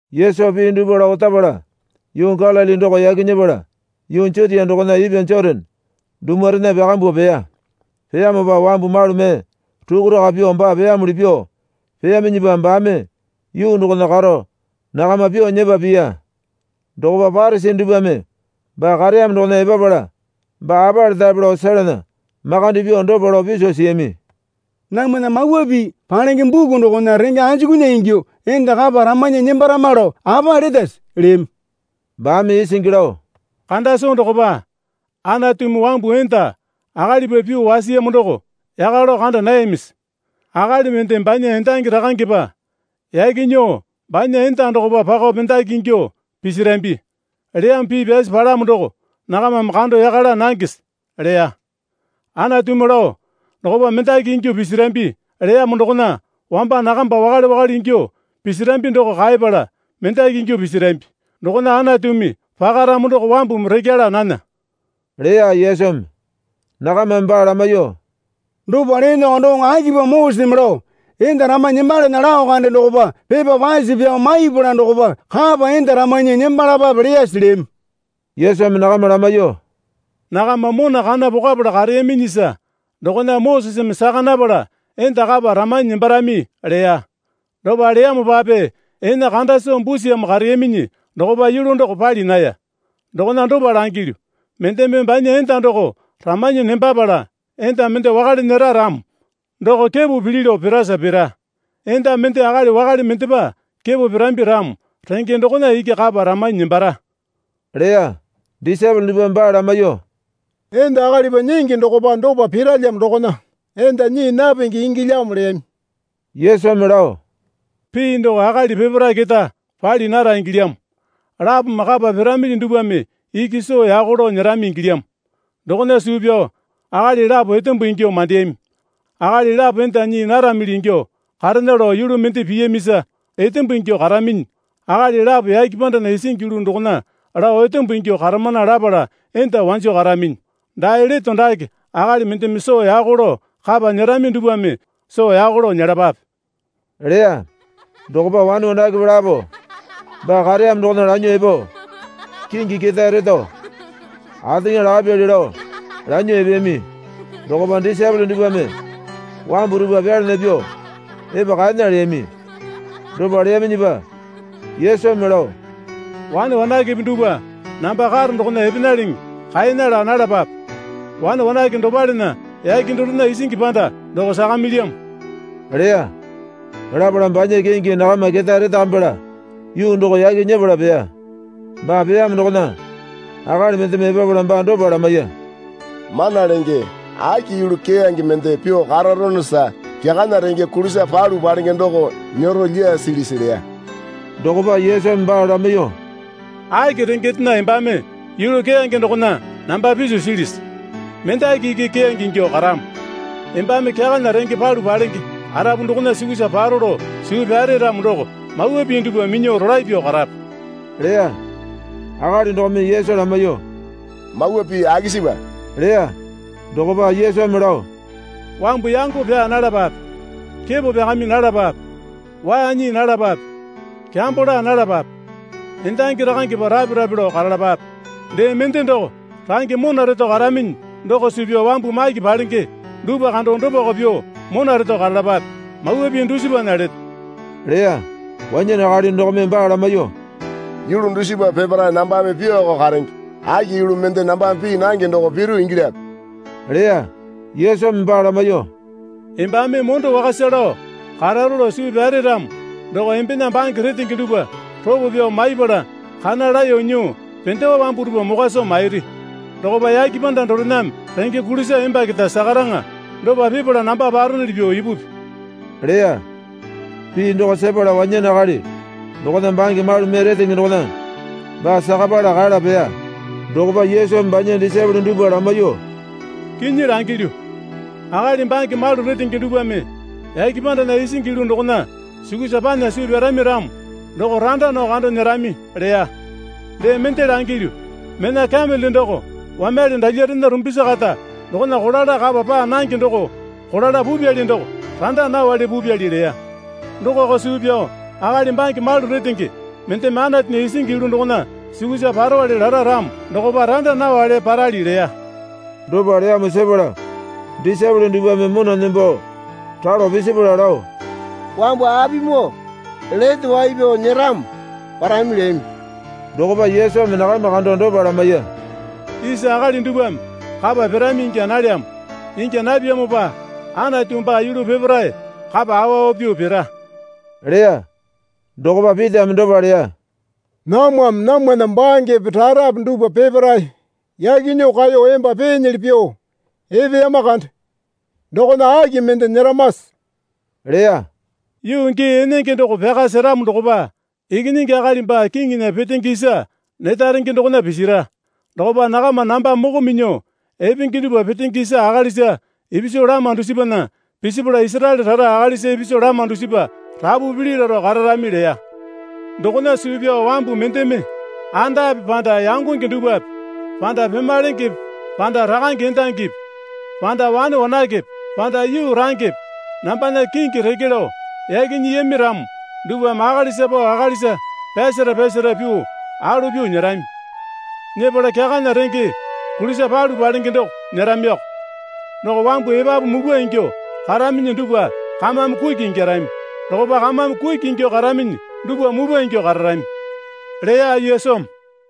Yesu pii dupwa lao otapala yuu Galili doko yaki nyepala yuu Jutia dokona ipwa Jotane dumwarena pyakambuo peya. Peyamopa wambu malu mee rukuraka pyuo baa peyamuli pyuo peyaminyipa baame yuu dokona karo nakama pyuo nyepa piya. Dokopa Parisi dupwame baa kareyamo dokona epapala baa apa letape lao selana makande pyuo dopa lao piso siyami. Namwana Mawa Pii palenge buku dokona renge anjukunya ingyuo enda kapa ramanyi nembarama lao apa letase? leyami. Baame isingi lao, Kanda soo dokopa Anatumi wambu enda akalipa pyuo wasiyamo doko yaka lao kanda nayamisi? Akali mende banya endangi rakangepa yaki nyuo banya enda dokopa pako mendaki ingyuo pisirambi, leyamo pii pyasi palamo doko nakamame kando yaka laa nangese? leya. Anatumi lao, Dokopa mendaki ingyuo pisirambi, leyamo dokona wamba nakamba wakale wakale ingyuo pisirambi doko kaepala mendaki ingyuo pisirambi. Dokona Anatumi pakaramo doko wambumi rekya laa nana, leya Yesumi. Nakamame baa lamaiyuo, Dopa leeneko doŋo akipamo Moseseme lao, Enda ramanyi nembalana lao kande dokopa pepa pase pyao maipala dokopa kapa enda ramanyi nembalapape, leyase? leyami. Yesumi nakama lamaiyuo, Nakama mona kana pokapala kareyaminyisa dokona Moseseme saka napala enda kapa ramanyi nembarami leya. Dopa leyamopape ene kanda soo busiyamo kareyaminyi dokopa yulu doko pali naya. Dokona dopa langilyu, Mendeme banya enda doko ramanyi nembapala enda mende wakale nyera ramo doko kepo pili lao pirasa pira. Enda mende akali wakale mendepa kepo pirambi ramo renge dokona iki kapa ramanyi nembara, leya. Disaepole dupwame baa lamaiyuo, Enda akalipa nyingi dokopa dopa piralyamo dokona enda nyii napenge ingyalyamo leyami. Yesumi lao, Pii doko akali peparae keta pali nara ingilyamo. Lapome kapa piramili dupwame iki soo yako lao nyerami ingilyamo. Dokona suu pyao akali lapo etembo ingyuo mandeyami, akali lapo enda nyii naramili ingyuo karena lao yulu mende piyamisa etembo ingyuo karaminyi, akali lapo yake pandana isingi yulu dokona lao etembo ingyuo karamana lapala enda wanjo karaminyi. Dae leto dake akali mendeme soo yako lao kapa nyerami dupwame soo yako lao nyelapape, leya. Dokopa wane wanakepe lapo baa kareyamo dokona lanyuo epo kingi ketae reto ateŋa lakapyali lao lanyuo epeyami. Dokopa disaepole dupwame wambu dupwa pyalana pyuo epa kaena leyami. Dopa leyaminyipa Yesumi lao, Wane wanakepe dupwa namba karo dokona epenaleŋe kaena laa nalapape. Wane wanake dopalena yake dorena isingi panda doko sakamilyamo, leya. Lapala banya kingi nakama ketae retakamipala yuu doko yaki nyepala peya. Baa peyamo dokona akali mendeme epapala baa dopa lamaiya. Mana Lenge aki yulu keyange mende pyuo kararonosa kyakana renge kulisa palu palenge doko nyero lyasilisi? leya. Dokopa Yesumi baa lamaiyuo, Aki rengendena embame yulu keyange dokona namba piso silisi? Mendaki iki keyange ingyuo karamo. Embame kyakana renge palu palenge arapu dokona sukusa paro lao suu pyare ramo doko mawa pii dupwa minyuo rolae pyuo karape, leya. Akali dokome Yesu lamaiyuo, Mawa pii akisipa? leya. Dokopa Yesumi lao, Wambu yango pyaa nalapape, Kepo pyakami nalapape, Waa nyii nalapape, Kyambo laa nalapape, Endangi rakangepa rape rape lao karalapape. Dee mende doko range mona reto karaminyi doko suu pyao wambu maki palenge dupwa kando dopako pyuo mona reto karalapape, mawa pii dusipana leto, leya. Wanyane akali dokome baa lamaiyuo, Yulu dusipa peparae nambame pyuoko karenge. Aki yulu mende nambame pii nange doko piru ingilyape? leya. Yesumi baa lamaiyuo, Embame mondo wakasa lao kararo lao suu pyare ramo doko embena bange retenge dupwa ropo pyao maipala kana laeyo nyuo pendewa wambu dupwa mokwa soo mairi. Dokopa yake panda dorename renge kulisa emba keta sakaraŋa. Dopa pipala namba paronuli pyuo ipupi, leya. Pii doko sepala wanyane akali dokona bange malu mee retenge dokona baa sakapala kala peya. Dokopa Yesumi banya disaepole dupwa lamaiyuo, Kinyi langilyu, Akali bange malu retenge dupwame yake pandana isingi yulu dokona sukusa panya suu pyarami ramo doko randa nao kando nyerami, leya. Dee mende langilyu. Mena kamele doko wamyale dalyarena rumbisi kata dokona kolala kapa paa nange doko kolala pupyali doko randa nawale pupyali leya. Dokako suu pyao akali bange malu retenge mendeme Anatunya isingi yulu dokona sukusa parowale lara ramo dokopa randa nawale parali leya. Dopa leyamo sepala disaepole dupwame mona nembo ralo pisipala lao, Wambu apimoo lete wai pyao nyeramo parami leyami. Dokopa Yesumi nakama kando dopa lamaiya. Isa akali dupwame kapa pirami ingya nalyamo. Ingya napyamopa Anatu baa yulu peparae kapa awa awa pyuo pira, leya. Dokopa Pitame dopa leya. Namwame namwana bangepe rarape dupwa peparae yaki nyuo kaeyo emba peenyili pyuo epeyama kande. Dokona aki mende nyeramase? leya. Yuu gii enenge doko pyaka seramo dokopa Ikinyingi Akali baa kiŋinya petenge isa neta renge dokona pisira. Dokopa nakama namba moko minyuo epenge dupwa petenge isa akalisa ipisu lama dusipana pisipala Isaraele rara akalisa ipisu lama dusipa rapu pili laro kararami leya. Dokona suu pyao wambu mendeme andape panda yangonge dupwape panda pemalengepe panda rakange endangipi panda wane wanakepe panda yuu rangepe nambana kingi reke lao yaki nyiyami ramo dupwame akalisa pao akalisa pyasara pyasara pyuo alo pyuo nyerami. Nyepala kyakana renge kulisa palu palenge doko nyeramiko. Doko wambu epapu mupwa ingyuo karaminyi dupwa kamame kuki ingyarami. Dokopa kamame kuki ingyuo karaminyi dupwa mupwa ingyuo kararami, leya Yesumi.